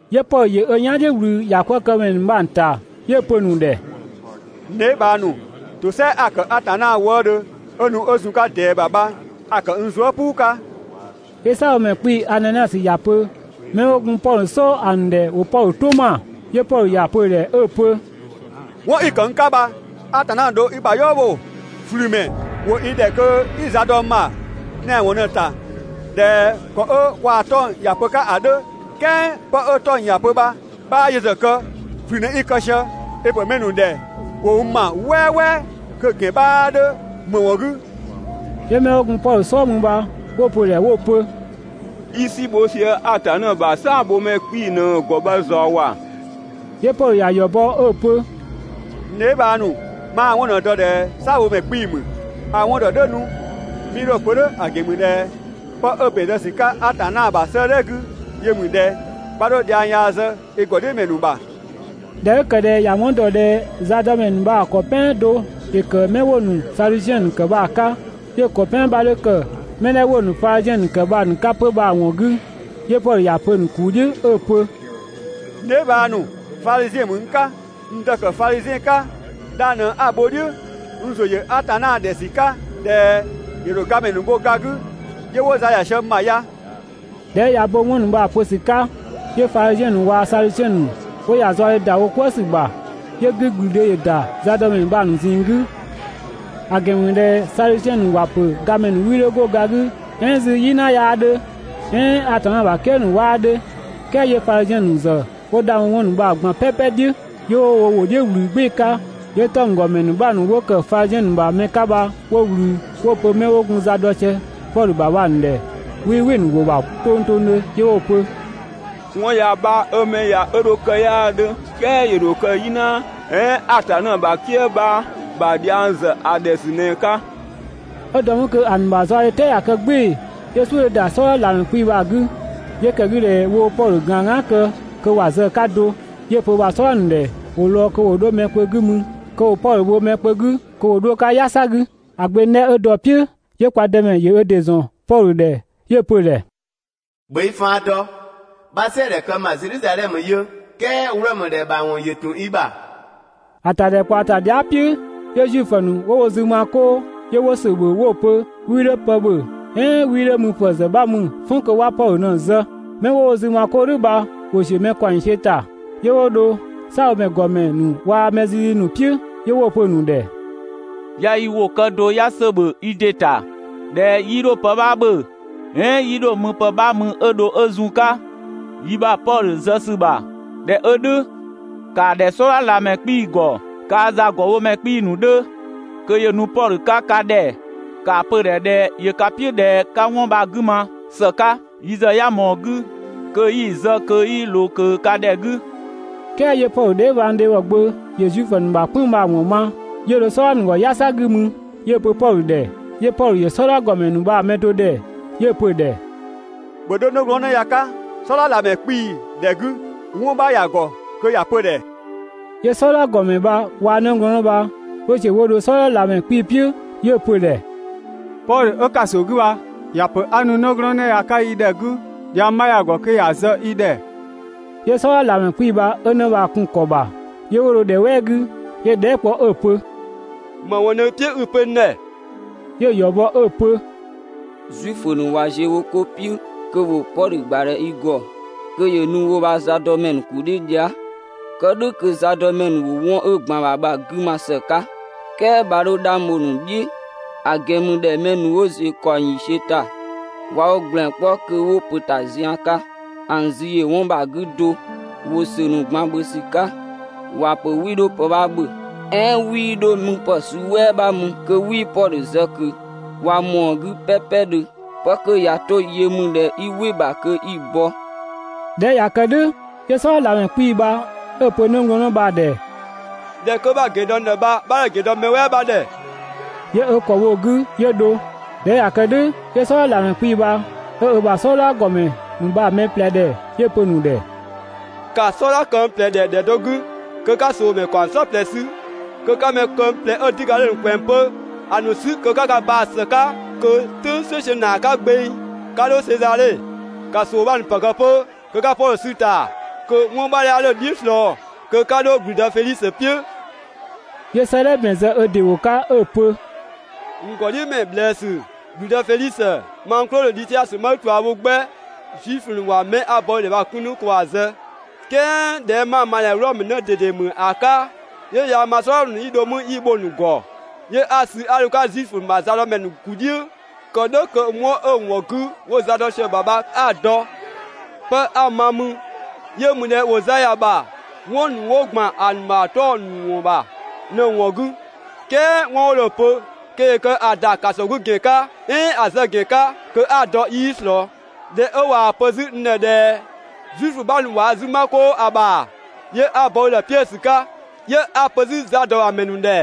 'Yö Pɔdhö ‑yö ö "yan "dhiʋ̈ ꞊wlü ‑ya 'kwëë‑ këmɛ ‑nu bha‑ ‑nu ‑ta, 'yö‑ pö‑ ‑nu ‑dhɛ: «N dheebhang ‑nu, ‑tosɛa 'a‑ ‑kë Atanna wëëdhö 'ö nu 'ö zun‑ 'ka ꞊dɛɛ ‑bha bha a‑ ‑kë n zuë" "puu 'ka.» 'Yö "saabhomɛ ‑nu ‑gɔmɛ Ananiasö ‑ya pö 'mɛ 'wo gun Pɔdhö "sɔɔ ‑a ‑nu ‑dhɛ ‑wo Pɔdhö "tʋ ‑ma. 'Yö Pɔdhö ‑ya pö‑ ‑dhɛ 'ö‑ pö: «'Wɔn 'i‑ ‑kë n 'ka bha Atanna ꞊në dho i ‑bha "yɔɔ bho, ꞊flümɛ. ‑Wo i ‑dhɛ kö 'i za dɔ n ‑bha tɛanwɔn ꞊në‑ ‑ta ꞊dhɛ ‑kɔ 'ö kwaa‑ 'tɔng‑ ‑ya pö‑ 'ka ‑a 'dhö, "kɛɛ 'pë 'ö 'tɔng‑ ‑ya pö 'bhaa yö ‑zë kë, ꞊flü ꞊në 'i‑ kë sië, i‑ ‑pö mɛ ‑nu ‑dhɛ ‑wo n ‑ma "wɛɛwɛɛ kö‑ ‑gɛn 'bhaa 'dhö ‑më ‑wɔn 'gü?» 'Yö 'mɛ 'wo gun Pɔdhö "sɔɔ mü bha 'wo‑ pö‑ ‑dhɛ 'wo‑ pö: «I "si bho sië Atanna ‑bha "saabhomɛ ‑nu ‑gɔmɛ 'kpii‑ ꞊në‑ ‑gɔ bha ꞊zɔɔ ‑wa!» 'Yö Pɔdhö ‑ya ‑yɔ bɔ 'ö‑ pö: «N dheebhang ‑nu, 'maa‑ 'wɔn ꞊në‑ dɔ ꞊dhɛ "saabhomɛ 'kpii‑ ‑mü, (a‑ 'wɔn ‑dɔ "dhʋ̈ 'nu 'mii dho‑ pö "dhʋ̈ ‑a ‑gɛn ‑mü ꞊dhɛ) 'pë 'ö ‑bɛn zë ‑sü 'ka Atanna ‑bha 'sëëdhɛ 'gü yö ‑mü ꞊dhɛ: ‹'Bha 'dho dhiang yaa zë i ‑gɔdhiʋ̈mɛ ‑nu ‑bha›.» ꞊Dhɛ 'ö ‑kë ꞊dhɛ ‑ya 'wɔn ‑dɔ ꞊dhɛ zadɔmɛ ‑nu bha‑ mɛ ‑kɔ "pɛan do ‑yö ‑kë 'mɛ 'wo‑ ‑nu Sadusiɛn ‑nu ‑kë bha‑ 'ka, 'yö‑ ‑kɔ "pɛan 'bha 'dhö mɛ 'dhɛ 'wo‑ ‑nu Fadhiziɛn ‑nu ‑kë bha‑ ‑nu 'ka 'pö bha‑ ‑wɔn 'gü, 'yö Pɔdhö ‑ya pö‑ ‑nu ‑kuu "dhiʋ̈ 'ö‑ pö: «N dheebhang ‑nu, Fadhiziɛn ‑mü n 'ka, n dë‑ ‑kë Fadhiziɛn 'ka. 'Dhang ꞊në 'a‑ bho "dhiʋ̈, n ‑zʋ ‑yö Atanna ‑dhɛ ‑sü 'ka ꞊dhɛ ‑yö ‑dho gamɛ ‑nu bho ga 'gü 'yö 'wo za ‑ya sië n ‑bha ya. ꞊Dhɛ 'ö ꞊ya ö bo 'wɔn ‑nu bha‑ pö ‑sü 'ka, 'yö Fadhiziɛn ‑nu waa‑ Sadusiɛn ‑nu 'wo ‑ya zaɔdhe ‑da wo "kwëë ‑sü ‑bha, 'yö 'gügblüdhe ‑yö ‑da zadɔmɛ ‑nu bha‑ ‑nu ꞊zinng 'gü, (‑a ‑gɛn ‑mü ꞊dhɛ Sadusiɛn ‑nu ‑wa ‑pö gamɛ ‑nu 'wii 'dho 'go ga 'gü "ɛɛn 'zü "yina 'yaa 'dhö, "ɛɛn Atanna ‑bha "kië ‑nu 'waa 'dhö, "kɛɛ 'yö Fadhiziɛn ‑nu ‑zë 'wo 'dhang bho 'wɔn ‑nu bha‑ ꞊gban "pɛpɛ "dhiʋ̈.) 'Yö 'wo wo ‑wʋ "dhiʋ̈ ꞊wlü "gbɩɩ‑ 'ka, 'yö 'tɔnggɔmɛ ‑nu 'bha ‑nu 'wo ‑kë Fadhiziɛn ‑nu ‑bha mɛ 'ka bha 'wo ꞊wlü, 'wo‑ pö 'mɛ 'wo gun za dɔ sië Pɔdhö ‑bha bha‑ ‑nu ‑dhɛ ꞊dhɛ 'wii "wɩ‑ ‑nu ‑wʋ ‑bha tongtongdhö, 'yö 'wo‑ pö: «'Wɔn yaa 'bha 'ö 'mɛ ya 'ö dho‑ kë 'yaa 'dhö, "kɛɛ ‑yö ‑dho kë "yina "ɛɛn Atanna ‑bha "kië 'bha ‑bha dhiang ‑zë ‑a ‑dhɛ ‑sü ꞊në‑ 'ka. 'Ö dɔ mü kö ‑a ‑nu ‑bha zaɔdhe "tɛɛ ꞊ya kë "gbɩɩ‑, 'yö "suʋ̈ 'dhö ‑da "sɔdha ꞊lamɛ 'kpii‑ bha‑ 'gü, 'yö ‑kë 'gü ꞊dhɛ woo‑ Pɔdhö ꞊gaan "gaan kë kö ‑wa zë‑ 'ka do, 'yö‑ pö ö ‑bha "sɔdha ‑nu ‑dhɛ ‑wo lɔɔ‑ kö ‑wo 'dho mɛ kpö 'gü mü kö ‑wo Pɔdhö bho mɛ kpö 'gü kö ‑wo 'dho‑ 'ka "yasa 'gü. ‑A gbeng 'dhɛ 'ö dɔ‑ "piʋ̈, 'yö kwa Dëmɛ ‑yö ö ‑dɩ ‑zɔn Pɔdhö ‑dhɛ 'yö‑ pö‑ ‑dhɛ: «‑Bhö i faan dɔ, 'bha "sɛɛdhɛ kë n ‑bha Zedhizadhɛmö yö "kɛɛ Wlɔmö ‑dhɛ ‑bha ‑wɔn ‑yö ‑tun i ‑bha.» ‑A ‑tadhɛkpaɔ ‑ta dhia" "piʋ̈, 'yö Zuifö ‑nu 'wo wo zü ma 'koo 'yö 'wo ‑sö ‑bhö 'wo‑ pö 'wii 'dho pë ‑bhö "ɛɛn 'wii 'dho müpë ‑zë 'bha mü "fɔn kö 'wa Pɔdhö ꞊në‑ zë. 'Mɛ 'wo wo zü ma 'koo "dhʋ̈ bha ‑wo ‑ziö mɛ ‑kaɔng ‑yiisiö ‑ta. 'Yö 'wo dho "saabhomɛ ‑gɔmɛ ‑nu waa‑ mɛ zizi ‑nu "piʋ̈, 'yö 'wo‑ pö‑ ‑nu ‑dhɛ: «'Ya yi ‑wʋ kë do 'ya ‑sö ‑bhö yi ‑dɩ ‑ta ꞊dhɛ, 'yii dho pë 'bha ‑bhö "ɛɛn 'yii 'dho müpë 'bha mü 'ö dho ö zun‑ 'ka yi ‑bha Pɔdhö zë ‑sü ‑bha. ꞊Dhɛ 'ö "dhʋ̈, ‑kaa ‑dhɛ "sɔdha ꞊lamɛ 'kpii‑ ‑gɔ kaa‑ zagɔbhomɛ 'kpii‑ ‑nu 'dhö kö ‑yö nu Pɔdhö 'ka ka ‑dhɛ, ‑kaa pö‑ ‑dhɛ ꞊dhɛ ‑yö ka "piʋ̈ ꞊dhɛ 'ka 'wɔn bha‑ 'gü ma ‑së 'ka. Yi ‑zë 'ya ꞊mɔɔ‑ 'gü kö 'yi‑ zë kö 'yii ꞊loo ꞊kö ka ‑dhɛ 'gü.» "Kɛɛ 'yö Pɔdhö dheebhang ‑dhebhɔ gbö ‑yö Zuifö ‑nu ‑bha "kpënng‑ bha‑ ‑wɔn ma, 'yö dho "sɔdha ‑nu ‑gɔ "yasa 'gü mü 'yö‑ pö Pɔdhö ‑dhɛ. 'Yö Pɔdhö ‑yö "sɔdha ‑gɔmɛ ‑nu bha‑ mɛ do ‑dhɛ 'yö‑ pö‑ ‑dhɛ: «‑Bhö 'dho 'nëglɔɔnnë ya‑ 'ka "sɔdha ꞊lamɛ 'kpii‑ ‑dhɛ 'gü, 'wɔn 'bha ‑ya ‑gɔ kö ‑ya pö‑ ‑dhɛ.» 'Yö "sɔdha ‑gɔmɛ bha waa‑ 'nëglɔɔnnë bha 'wo ‑ziö 'wo dho "sɔdha ꞊lamɛ 'kpii‑ "piʋ̈ 'yö‑ pö‑ ‑dhɛ: «Pɔdhö 'ö ‑kaso 'gü bha ‑ya ‑pö 'a nu 'nëglɔɔnnë ya‑ 'ka i ‑dhɛ 'gü, dhiang 'bha ‑ya ‑gɔ kö ‑ya zë i ‑dhɛ.» 'Yö "sɔdha ꞊lamɛ 'kpii‑ bha 'ö 'në bha‑ kun‑ ‑kɔ ‑bha, 'yö 'wo dho ‑dhɛ "wɛɛ 'gü, 'yö‑ dhɛɛ" kpɔ 'ö‑ pö: «‑Më ‑wɔn ꞊në i "piʋ̈ 'i‑ pö n ‑dhɛ?» 'Yö‑ ‑yɔ bɔ 'ö‑ pö: «Zuifö ‑nu ꞊wa ziö wo 'ko "piʋ̈ kö ‑wo Pɔdhö ‑gbadhɛ i ‑gɔ kö ‑yö nu wo ‑bha zadɔmɛ ‑nu ‑kuu "dhiʋ̈ dhia". Kë "dhʋ̈ kö zadɔmɛ ‑nu ‑wo 'wɔn 'ö ‑gban ‑a ‑bha bha‑ 'gü ma ‑së 'ka. "Kɛɛ 'bha 'dho 'dhang bho‑ ‑nu "dhiʋ̈, ‑a ‑gɛn ‑mü ꞊dhɛ mɛ ‑dhü 'ö ‑ziö ‑kaɔng ‑yiisiö ‑ta, ꞊wa wo ‑gblɛn 'kpɔ kö 'wo ‑pö ‑ta zian 'ka, ‑a ‑nu zü ‑yö do 'wɔn bha‑ 'gü, ꞊wa ‑sö ‑nu ꞊gban ‑bhö ‑wa ‑pö 'wii 'dho pë 'bha ‑bhö "ɛɛn 'wii dho müpë suu "wɛɛwɛ 'bha mü kö 'wii Pɔdhö zë ꞊kö. ꞊Wa ꞊mɔɔ‑ 'gü "pɛpɛdhö, 'pë 'kö ꞊ya 'to yö ‑mü ꞊dhɛ kö 'i "wɩ‑ ‑bha kö 'i‑ bɔ.» ꞊Dhɛ 'ö ꞊ya kë "dhʋ̈, 'yö "sɔdha ꞊lamɛ 'kpii‑ bha 'ö‑ pö 'nëglɔɔnnë bha‑ ‑dhɛ: «꞊Dhɛ 'kö 'bha‑ pö n ‑dhɛ bha 'bha 'dho‑ ‑gɛn dɔ mɛ "wɛɛ 'bha ‑dhɛ.» 'Yö ö ‑kɔ bho‑ 'gü 'yö dho. ꞊Dhɛ 'ö ꞊ya kë "dhʋ̈ 'yö "sɔdha ꞊lamɛ 'kpii‑ bha 'ö ö ‑bha "sɔdha ‑gɔmɛ ‑nu bha‑ mɛ ꞊plɛ ‑dhɛ, 'yö‑ pö‑ ‑nu ‑dhɛ: «‑Ka "sɔdha këng ꞊plɛ ‑dhɛ ‑dhɛ do 'gü kö 'ka ꞊soomɛ ‑nu ‑kaɔng "saɔplɛ 'sü kö 'ka mɛ këng ꞊plɛ 'ö 'düga 'dhö‑ ‑nu ꞊kwɛɛ‑ 'pö ‑a ‑nu 'sü kö 'ka ka baa‑ ‑së 'ka, kö "tʋ̈ng "sueisiö ‑naa 'ka gbeng, 'ka 'dho Sezadhe. ‑Ka ꞊soo 'bha ‑nu ‑pë kë 'pö kö 'ka Pɔdhö 'sü‑ ‑ta kö 'wɔn 'bha 'ya 'dho‑ "dhiʋ̈ ꞊slɔɔ, kö 'ka 'dho ‑gblüdë Fedhisö "piʋ̈.» 'Yö 'sëëdhɛ ‑bɛn zë ö ‑dɩ ‑wʋ 'ka 'ö‑ pö: «N ‑gɔdhiʋ̈mɛ ꞊bhlëësü, ‑gblüdë Fedhisö, mang Klodö Dhisiasö 'ma i ꞊tua bho 'gbɛ! Zuifö ‑nu ꞊wa 'mɛ 'a‑ bɔ i ‑dhɛ bha‑ 'kun 'nu kö ‑wa zë, "kɛɛ ꞊dhɛ 'ma‑ ma ꞊dhɛ Wlɔmö 'në ꞊dede ‑mü ‑a 'ka, 'yö yaa‑ ma "sɔdha ‑nu 'yi dho mü 'yi‑ bho‑ ‑nu ‑gɔ, 'yö 'a‑ sü 'a dho‑ 'ka Zuifö ‑nu ‑bha zadɔmɛ ‑nu ‑kuu "dhiʋ̈, kë "dhʋ̈ kö 'wɔn 'ö‑ ‑wɔn 'gü 'wo za dɔ sië‑ ‑bha bha 'a‑ dɔ. 'Pë 'a‑ ma mü yö ‑mü ꞊dhɛ ‑wo za ‑ya ‑bha 'wɔn ‑nu 'wo ‑gban ‑a ‑nu ‑bha 'tɔng‑ ‑nu ‑wɔn ‑bha ꞊në‑ ‑wɔn 'gü, "kɛɛ 'wɔn 'wo dho‑ pö kö ‑yö kë ‑a ‑dho ‑kaso 'gü ‑gɛn 'ka, "ɛɛn ‑a zë ‑gɛn 'ka kö 'a‑ dɔ 'yii ꞊slɔɔ. ꞊Dhɛ 'ö ꞊waa‑ pö 'zü n ‑dhɛ ꞊dhɛ Zuifö 'bha ‑nu ꞊wa wo zü 'ma "kʋʋ ‑a ‑bha, 'yö 'a‑ bɔ i ‑dhɛ 'piö‑ ‑sü 'ka, 'yö 'a‑ pö 'zü za ‑dɔ ‑bha ‑mɛ ‑nu ‑dhɛ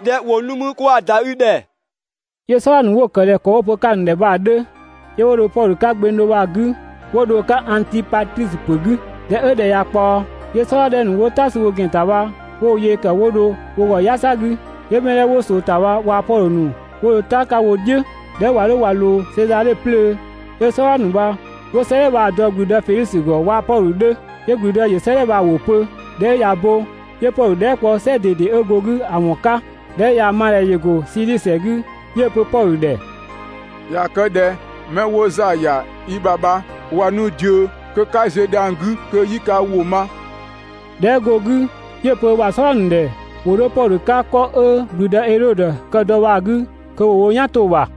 ꞊dhɛ ‑wo nu mü kö ‑wa ‑da i ‑dhɛ.» 'Yö "sɔdha ‑nu 'wo‑ ‑kë ꞊dhɛ ‑kɔ 'wo‑ pö‑ 'ka‑ ‑nu ‑dhɛ bha‑ 'dhö. 'Yö 'wo Pɔdhö sü gbeng do bha‑ 'gü 'wo dho‑ 'ka Angtipatrisö ‑pö 'gü. ꞊Dhɛ 'ö ‑dhɛ ꞊ya ꞊kpaɔ, 'yö "sɔdha 'dhɛ ‑nu 'wo "ta sü wo ‑gɛn ‑ta bha 'wo wo yee ‑kë 'wo dho wo ‑gɔ "yasa 'gü, 'yö mɛ 'dhɛ 'wo ꞊soo ‑ta bha waa‑ Pɔdhö ‑nu 'wo dho "ta 'ka wo "dhiʋ̈. ꞊Dhɛ 'ö ꞊wa 'dho ꞊wa ꞊loo Sezadhe 'plöö, 'yö "sɔdha ‑nu bha 'wo 'sëëdhɛ bha‑ dɔ ‑gblüdë Fedhisö ‑gɔ waa‑ Pɔdhö 'dhö. 'Yö ‑gblüdë ‑yö 'sëëdhɛ bha‑ ‑wʋ pö. ꞊Dhɛ 'ö ꞊ya bo, 'yö Pɔdhö dhɛɛ" kpɔ "sɛgɔ ꞊dede 'ö go‑ 'gü ‑a ‑wɔn 'ka. ꞊Dhɛ 'ö ꞊yaa‑ ma ꞊dhɛ ‑yö ‑go Sidhisi ‑sɛ 'gü, 'yö‑ pö Pɔdhö ‑dhɛ: «꞊Ya kë ꞊dhɛ mɛ 'wo za ‑ya i ‑bha bha ꞊wa nu ꞊diö kö 'ka ziö dhiang 'gü kö 'yi ka ‑wʋ ma.» ꞊Dhɛ 'ö go‑ 'gü, 'yö‑ pö ö ‑bha "sɔdha ‑nu ‑dhɛ ‑wo 'dho Pɔdhö 'ka 'kɔ 'ö ‑gblüdë Edhodö kë dɔ bha‑ 'gü kö ‑wo wo "yan 'to‑ ‑bha.